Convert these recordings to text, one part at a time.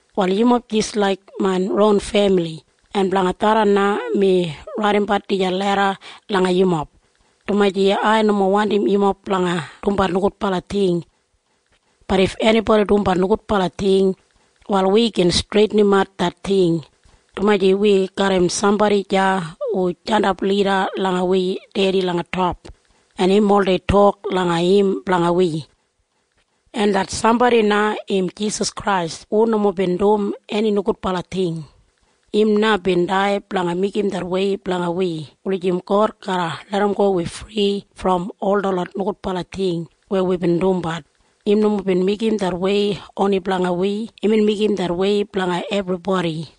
Wal yumob jis laik main ron femili. En blanga tharran na mi raidimbat dijan leda langa yumob, dumaji ai nomo wandim yumob blanga dumbat nogudbala ting. Bat if enibodi dumbat nogudbala ting, wal wi gin streitinimat det ting, dumaji wi garram sambodi deya hu jandap lida langa wi Dedi langa top, en im oldei tok langa im blanga wi. En det sambodi na im Jisas Krais hu nomo bin dum eni nogudbala ting. Im na bin dai blanga meigim det wei blanga wi wulijim God garra larramgo wi fri brom ol detlot nogudbala ting weya wibin dumbat. Im nomo bin meigim det wei oni blanga wi. Imbin meigim det wei blanga ebribodi.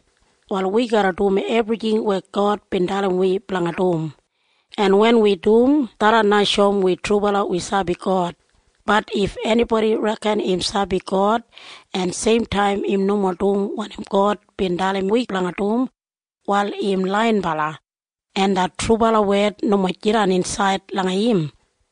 Wal wi garra dum ebrijing weya God bin dalim wi blanga dum. En wen wi dum, tharran na shoum wi trubala wi sabi God. Bat if enibodi reken im sabi God, en seimtaim im nomo dum wanim God bin dalim wi blanga dum, wal im laiyinbala, en det trubala wed nomo jidan insaid langa im.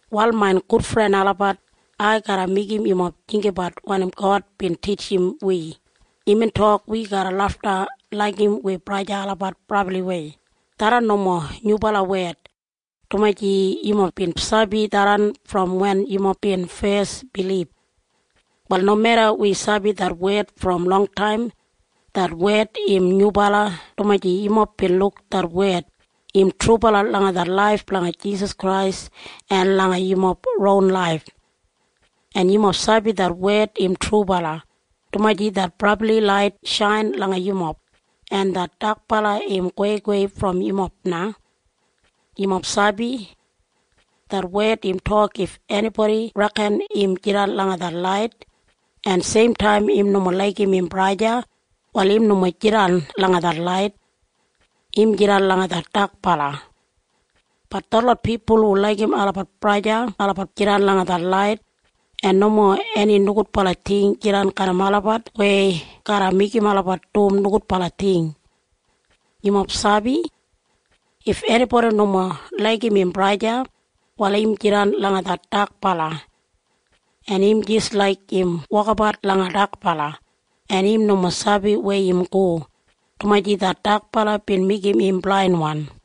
Wal main gudfren olabat, ai garra meigim yumob jinggabat wanim God bin titjim wi. Imbin tok wi garra lafta laigim wi braja en sista olabat brabliwei. Tharran nomo nyubala wed, dumaji yumob bin sabi tharran brom wen yumob bin fes bilib. Wal nomeda wi sabi det wed brom longtaim, det wed im nyubala dumaji yumob bin luk det wed, im trubala langa det laif blanga Jisas Krais en langa yumob ron laif. En yumob sabi det wed im trubala, dumaji det brabli lait shain langa yumob, en det dakbala im goweigowei brom yumob na. Yumob sabi? Det wed im tok if enibodi reken im jidan langa det lait, en seimtaim im nomo laigim im braja o sista, wal im nomo jidan langa det lait. Im jidan langa det dakbala. Bat detlot pipul hu laigim olabat braja en sista, olabat jidan langa det lait, en nomo eni nogudbala ting jidan garram olabat weya garra meigim olabat dum nogudbala ting. Yumob sabi? If enibodi nomo laigim im braja o sista, wal im jidan langa det dakbala. En im jis laik im wokabat langa dakbala, en im nomo sabi weya im go, dumaji det dakbala bin meigim im blainwan.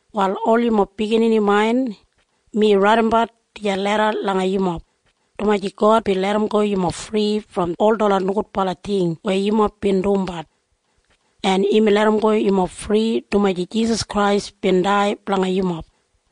Wal ol yumob biginini main, mi raidimbat dijan leda langa yumob, dumaji God bin larramgo yumob fri brom ol detlot nogudbala ting weya yumob bin dumbat. En imbin larramgo yumob fri dumaji Jisas Krais bin dai blanga yumob.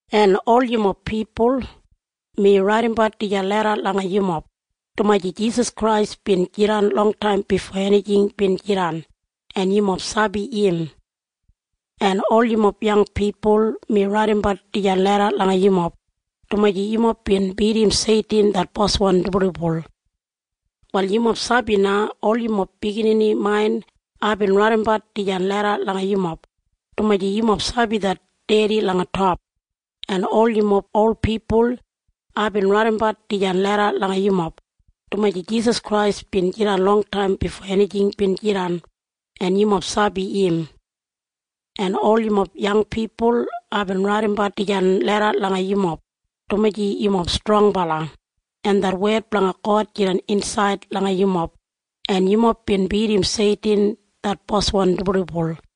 En ol yumob pipul, mi raidimbat dijan leda langa yumob, dumaji Jisas Krais bin jidan longtaim bifo enijing bin jidan, en yumob sabi im. En ol yumob yang pipul, mi raidimbat dijan leda langa yumob, dumaji yumob bin bidim Seitin det boswan dibuldibul. Wal yumob sabi na? Ol yumob biginini main, aibin raidimbat dijan leda langa yumob, dumaji yumob sabi det Dedi langa top. En ol yumob ol pipul, aibin raidimbat dijan leda langa yumob, dumaji Jisas Krais bin jidan longtaim bifo enijing bin jidan, en yumob sabi im. En ol yumob yang pipul, aibin raidimbat dijan leda langa yumob, dumaji yumob strongbala, en det wed blanga God jidan insaid langa yumob, en yumob bin bidim Seitin det boswan dibuldibul.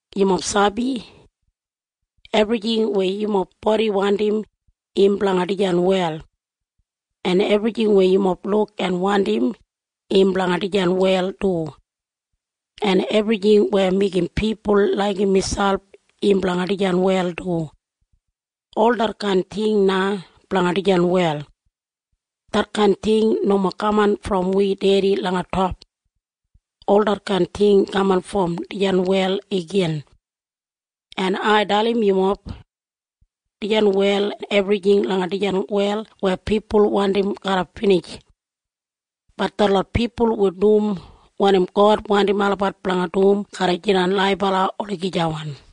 Yumob sabi? Ebrijing weya yumob bodi wandim, im blanga dijan wel. En ebrijing weya yumob luk en wandim, im blanga dijan wel du. En ebrijing weya meigim pipul laigim miselp, im blanga dijan wel du. Ol detkain ting na blanga dijan wel. Detkain ting nomo kaman brom wi Dedi langa top. Ol detkain ting kaman brom dijan wel igin. En ai dalim yumob. Dijan wel en ebrijing langa dijan wel weya pipul wandim garra binij. Bat detlot pipul hu dum wanim God wandim olabat blanga dum garra jidan laibala olagijawan.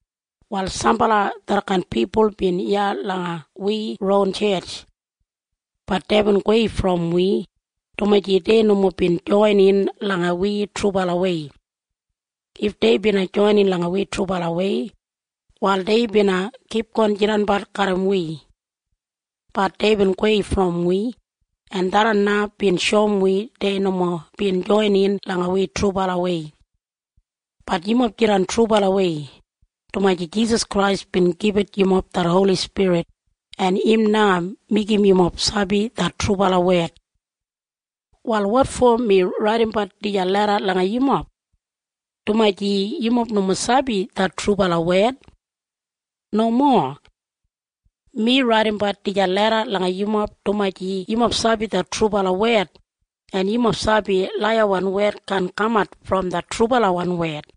Wal sambala detkain pipul bin iya langa wi ron tjetj. Bat deibin gowei brom wi, dumaji dei nomo bin joinin langa wi trubalawei. If dei bina joinin langa wi trubalawei, wal dei bina kipgon jidanbat garram wi. Bat deibin gowei brom wi, en tharran na bin shoum wi dei nomo bin joinin langa wi trubalawei. Bat yumob jidan trubalawei, dumaji Jisas Krais bin gibit yumob det Holi Spirit, en im na meigim yumob sabi det trubala wed. Wal wotfo mi raidimbat dijan leda langa yumob? Dumaji yumob nomo sabi det trubala wed? Nomo. Mi raidimbat dijan leda langa yumob dumaji yumob sabi det trubala wed, en yumob sabi laiyawan wed kaan kamat brom det trubalawan wed.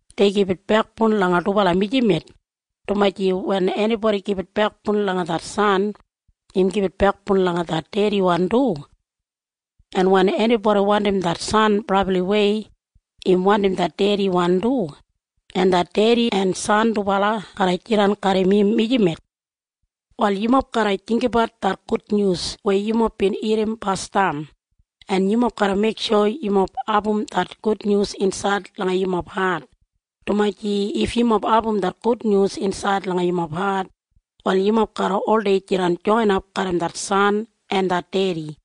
Dei gibit bekboun langa dubala mijamet, dumaji wen enibodi gibit bekboun langa det San, im gibit bekboun langa det Dediwan du. En wen enibodi wandim det San brabliwei, im wandim det Dediwan du, en det Dedi en San dubala garra jidan garram im mijamet. Wal yumob garra jinggabat det gudnyus weya yumob bin irrim basdam, en yumob garra meiksho yumob abum det gudnyus insaid langa yumob hat, dumaji if yumob abum det gudnyus insaid langa yumob hat, wal yumob garra oldei jidan joinap garram det San en det Dedi.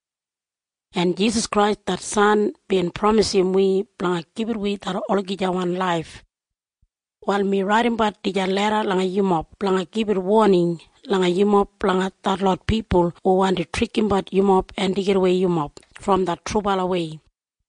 En Jisas Krais det San bin pramisim wi blanga gibit wi det olagijawan laif. Wal mi raidimbat dijan leda langa yumob blanga gibit woning langa yumob blanga detlot pipul hu wandi trikimbat yumob en deigidawei yumob brom det trubalawei.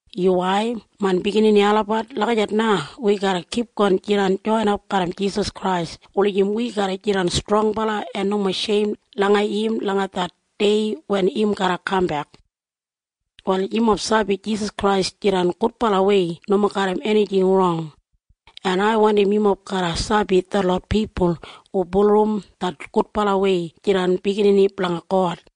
Yuwai, main biginini olabat. Lagijat na wi garra kipgon jidan joinap garram Jisas Krais wulijim wi garra jidan strongbala en nomo sheim langa im langa det dei wen im garra kambek. Wal yumob sabi Jisas Krais jidan gudbalawei nomo garram enijing rong, en ai wandim yumob garra sabi detlot pipul hu bulurrum det gudbalawei jidan biginini blanga God.